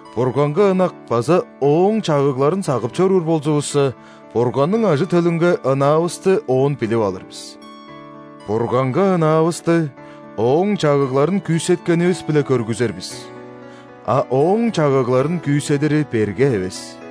Бурганга ынак база Ооң чагыгларын сагып чоруур болзувусса, Бурганның ажы-төлүнге ынаавысты оон билип алыр бис. Бурганга ынаавысты Ооң чагыгларын күүсеткенивис-биле көргүзер бис, а Ооң чагыгларын күүседири берге эвес.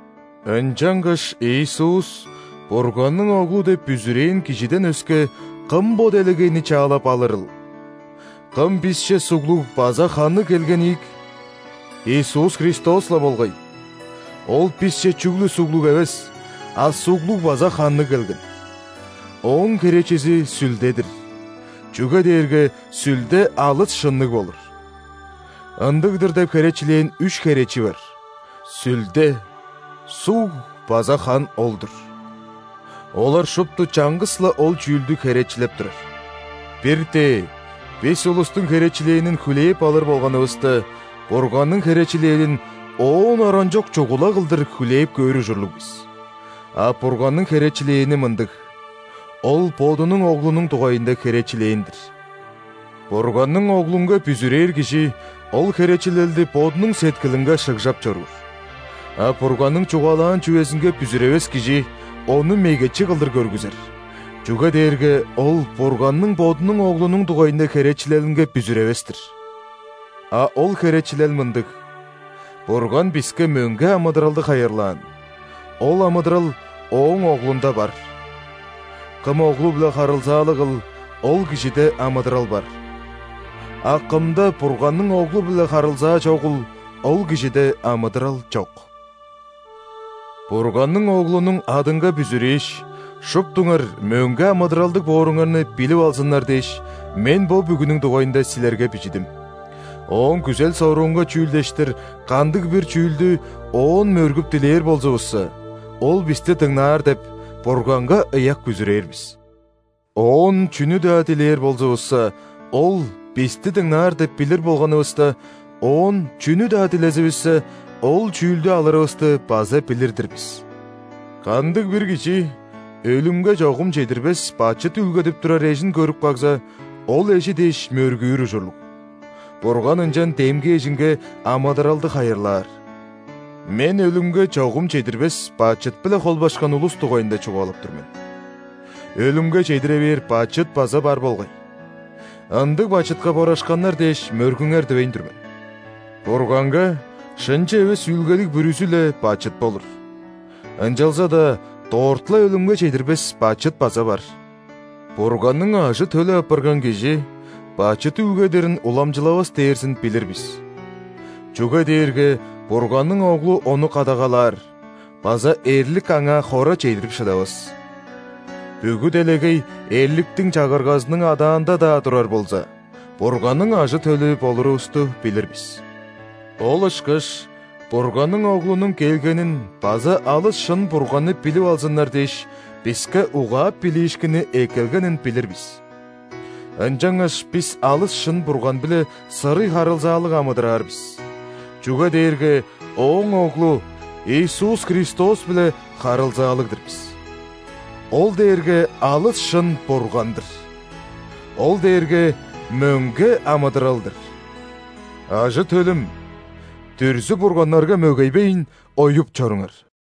Ынчангаш Иисус – Бурганның Оглу деп бүзүрээн кижиден өске, кым бо делегейни чаалап алырыл? Кым бисче суглуг база ханныг келген ийик? Иисус Христос-ла болгай. Ол бисче чүгле суглуг эвес, а суглуг база ханныг келген. Ооң херечизи – Сүлде-дир, чүге дээрге Сүлде алыс шынныг болур. Ындыг-дыр деп херечилээн үш херечи бар: Сүлде, суг база хан ол-дур. Олар шупту чаңгыс-ла ол чүүлдү херечилеп турар. Бир-тээ бис улустуң херечилээнин хүлээп алыр болганывыста, Бурганның херечилелин оон оранчок чугула кылдыр хүлээп көөр ужурлуг бис. А Бурганның херечилээни мындыг: Ол Бодунуң Оглунуң дугайында херечилээн-дир. Бурганның Оглунга бүзүрээр кижи ол херечилелди бодунуң сеткилинге шыгжап чоруур. А Бурганның чугаалаан чүвезинге бүзүревес кижи Ону мегечи кылдыр көргүзер, чүге дээрге ол Бурганның Бодунуң Оглунуң дугайында херечилелинге бүзүревес-тир. А ол херечилел мындыг: Бурган биске мөңге амыдыралды хайырлаан, ол амыдырал Ооң Оглунда бар. Кым Оглу-биле харылзаалыгыл, ол кижиде амыдырал бар, а кымда Бурганның Оглу-биле харылзаа чогул, ол кижиде амыдырал чок. Бурганның Оглунуң адынга бүзүрээш, шуптуңар мөңге амыдыралдыг бооруңарны билип алзыннар дээш, мен бо бүгүнүң дугайында силерге бижидим. Ооң күзел-соруунга чүүлдештир кандыг-бир чүүлдү Оон мөргүп дилээр болзувусса, Ол бисти дыңнаар деп, Бурганга ыяк бүзүрээр бис. Оон чүнү-даа дилээр болзувусса, Ол бисти дыңнаар деп билир болганывыста, Оон чүнү-даа дилезивиссе, ол чүүлдү алырывысты база билир-дир бис. Кандыг-бир кижи өлүмге чогум чедирбес бачыт үүлгедип турар эжин көрүп кагза, ол эжи дээш мөргүүр ужурлуг, Бурган ынчан демги эжинге амыдыралды хайырлаар. Мен өлүмге чогум чедирбес бачыт-биле холбашкан улус дугайында чугаалап тур мен. Өлүмге чедире бээр бачыт база бар болгай. Ындыг бачытка борашканнар дээш мөргүңер дивейн тур мен. Бурганга шынчы эвес үүлгедиг бүрүзү-ле бачыт болур, ынчалза-даа дорт-ла өлүмге чедирбес бачыт база бар. Бурганның ажы-төлү апарган кижи бачыт үүлгедирин уламчылавас дээрзин билир бис. Чүге дээрге Бурганның Оглу ону кадагалаар база эрлик аңаа хора чедирип шыдавас. Бүгү делегей эрликтиң чагыргазының адаанда-даа турар болза, Бурганның ажы-төлү болурувусту билир бис. Ол ышкаш Бурганның Оглунуң келгенин база алыс шын Бурганны билип алзыннар дээш, биске угаап билиишкинни эккелгенин билир бис. Ынчангаш бис алыс шын Бурган-биле сырый харылзаалыг амыдыраар бис, чүге дээрге Ооң Оглу Иисус Христос-биле харылзаалыг-дыр бис. Ол дээрге алыс шын Бурган-дыр, Ол дээрге мөңге амыдырал-дыр. Ажы-төлүм, дүрзү-бурганнарга мөгейбейн, оюп чоруңар.